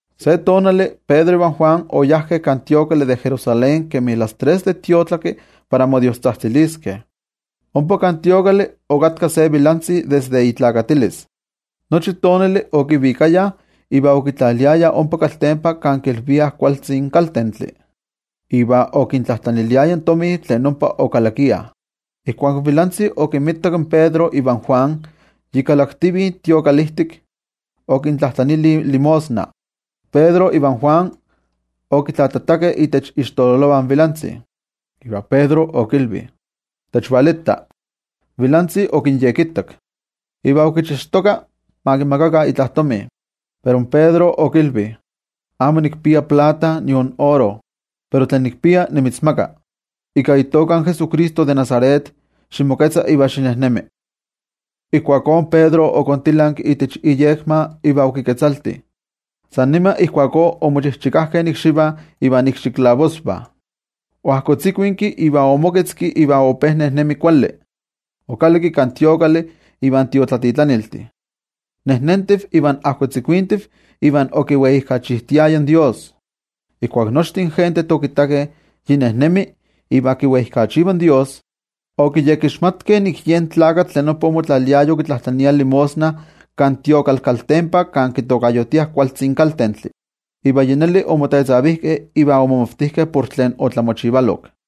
Se tonali, Pedro ivan Juan oyajkeh kan templo de Jerusalén kemi las tres de tiotlaki para modiostzajtziliskeh. Ompa kan templo okatka se vilantzi desde oneski, nochi tonali okivikayah iva okitlaliayah ompa kaltempa kan kilviah Kualtzin Kaltentli, iva okintlajtlaniliaya tomi tlen ompa okalakiah. Ijkuak in vilantzi okinmitak in Pedro ivan Juan yi kalaktivih kan templo, okintlajtlanili limosna. Pedro ivan Juan okitlajtlatakeh itech ixtololovah in vilantzi, iva Pedro okilvi: —Techvalita. In vilantzi okinyekittak, iva okichixtoka ma kimakakah itla tomi. Pero in Pedro okilvi: —Amo nikpia plata nion oro, pero tlen nikpia nimitzmaka: ika itoka in Jesucristo de Nazaret, ximoketza iva xinejnemi. Ijkuakó Pedro okontilanki itech iyekma iva okiketzalti. San nima ijkuakó omochikajkeh ikxivah iva ikxikechtlanvah. Oajkotzikuinki iva omoketzki iva ope nejnemi kuali. Okalakki kan templo ivan tiotlatitlaniltih, nejnentiv iva ajkotzikuintiv iva okiweijkachijtiaya in Dios. Ijkuak nochtin gentejtih okittakeh yi nejnemi iva kiweijkachiva in Dios, okiyekixmatkeh nik yen tlakatl tlen ompa omotlaliaya okitlajtlania limosna kan templo kaltempa kan kitokayotiah Kualtzi Kaltentli. Iva yi neli omotetzavijkeh iva omomavtijkeh por tlen otlamochivalok.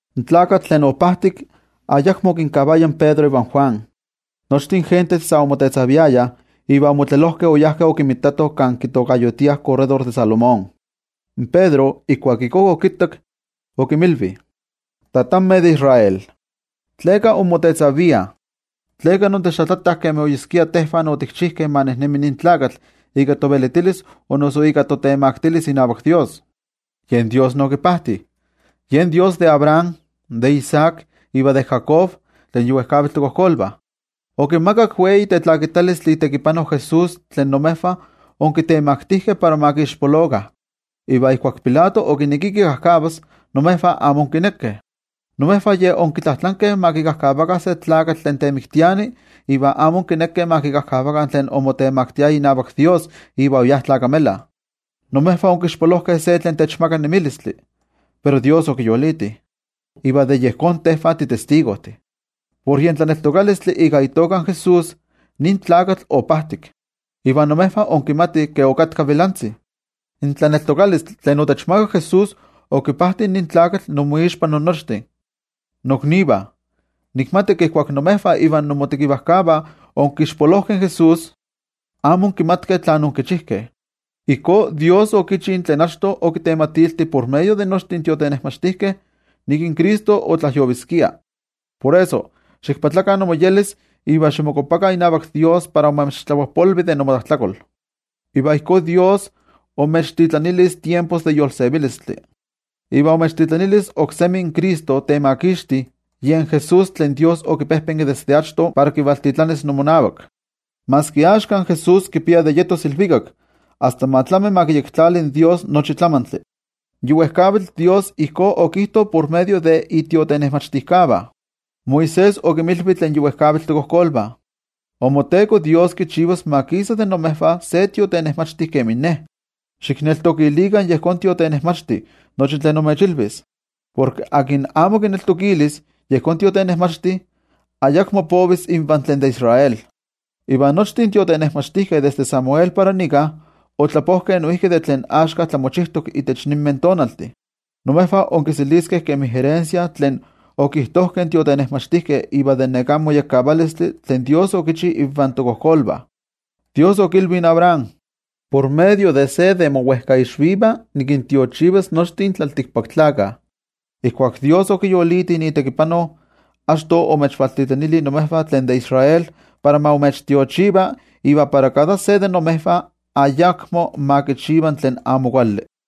In tlakatl tlen opajtik ayakmo okinkavaya in Pedro ivan Juan. Nochtin gentejtih sa omotetzaviayah iva omotlelojkeh oyajkeh okinmitatoh kan kitokayotiah Korredor de Salomón. In Pedro ijkuak ijkó okittak, okinmilvi: —Tatanmeh de Israel, ¿tleka inmotetzaviah? ¿Tleka intechtlajtlatah kemi oyeskia tejvah otikchijkeh ma nejnemi nin tlakatl ika tovelitilis o noso ika totemaktilis inavak toYejwatzi? Yen toYejwatzi Dios okipajti. Tlen Dios de Abraham, de Isaac, iva de Jacob, tlen yi wejkavitl tokojkolvah, okimakak wei tetlakitalistli itekipano Jesús, tlen imejvah onkitemaktijkeh para ma kixpolokah. Iva ijkuak Pilato okinekia kikajkavas, imejvah amo onkinekeh. Imejvah yej onkitlajtlankeh ma kikajkavakah se tlakatl tlen temiktiani, iva amo onkinekeh ma kikajkavakah tlen omotemakti inavak toYejwatzi iva oyá tlakamela. Imejvah onkixpolojkeh tlen techmaka nemilistli, pero toYejwatzi okiyoliti, iva de yejón tejvah titestigojtih. Por yen tlaneltokalistli ika itoka in Jesús, nin tlakatl opajtik, iva imejvah inkimatih ke okatka vilantzi. In tlaneltokalistli tlen otechmakak Jesús okipajti nin tlakatl inmoixpa innochtin. ’Noknivah, nikmati ke ijkuak imejvah ivan inmotekivajkavah onkixpolojkeh in Jesús, amo onkimatkeh tlán onkichijkeh. Ijkó toYejwatzi Dios okichi tlen achto okitematilti por medio de nochtin tiotenejmachtijkeh, nik in Cristo otlajyoviskia. Por eso, ximoyolkopakah iva ximokuapakah inavak toYejwatzi, para ma imechtlapojpolvi de inmotlajtlakol. Iva ijkó Ye imechvaltitlanilis tiempos de yolsevilistli, iva imechvaltitlanilis oksemi in Cristo tlen Temakixti, yen Jesús tlen toYejwatzi okipejpenki desde achto para kivaltitlanis inmonavak. Maski axka in Jesús kipia de yetos ilvikak asta ma tlami ma kiyektlali in toYejwatzi nochi tlamantli. Yi wejkavitl ijkó okijto por medio de itiotenejmachtijkavah. Moisés okinmilvi tlen yi wejkavitl tokojkolvah: “InmoTeko Dios kichivas ma kisa de imejvah se tiotenejmachti kemin ne. Xikneltokilikah yejón tiotenejmachti nochi tlen imechilvis, porke tlen amo kineltokilis yejón tiotenejmachti, ayakmo povis invan tlen de Israel.” ’Iva nochtin tiotenejmachtijkeh, desde Samuel para nika, otlapojkeh noijki de tlen axka tlamochijtok itech ninmeh tonaltih. Imejvah onkiseliskeh kemi erensia tlen okijtojkeh in tiotenejmachtijkeh iva de neká moyekkavalistli tlen toYejwatzi okichi invan tokojkolvah. In toYejwatzi okilvi in Abraham: “Por medio de se de mowejkaixvivah nikintiochivas nochtin tlaltikpaktlakah.” Ijkuak toYejwatzi okiyoliti itekipano, achto omechvaltitlanili imejvah tlen de Israel para ma imechtiochiva iva para kada se de imejvah ayakmo ma kichiva tlen amo kuali.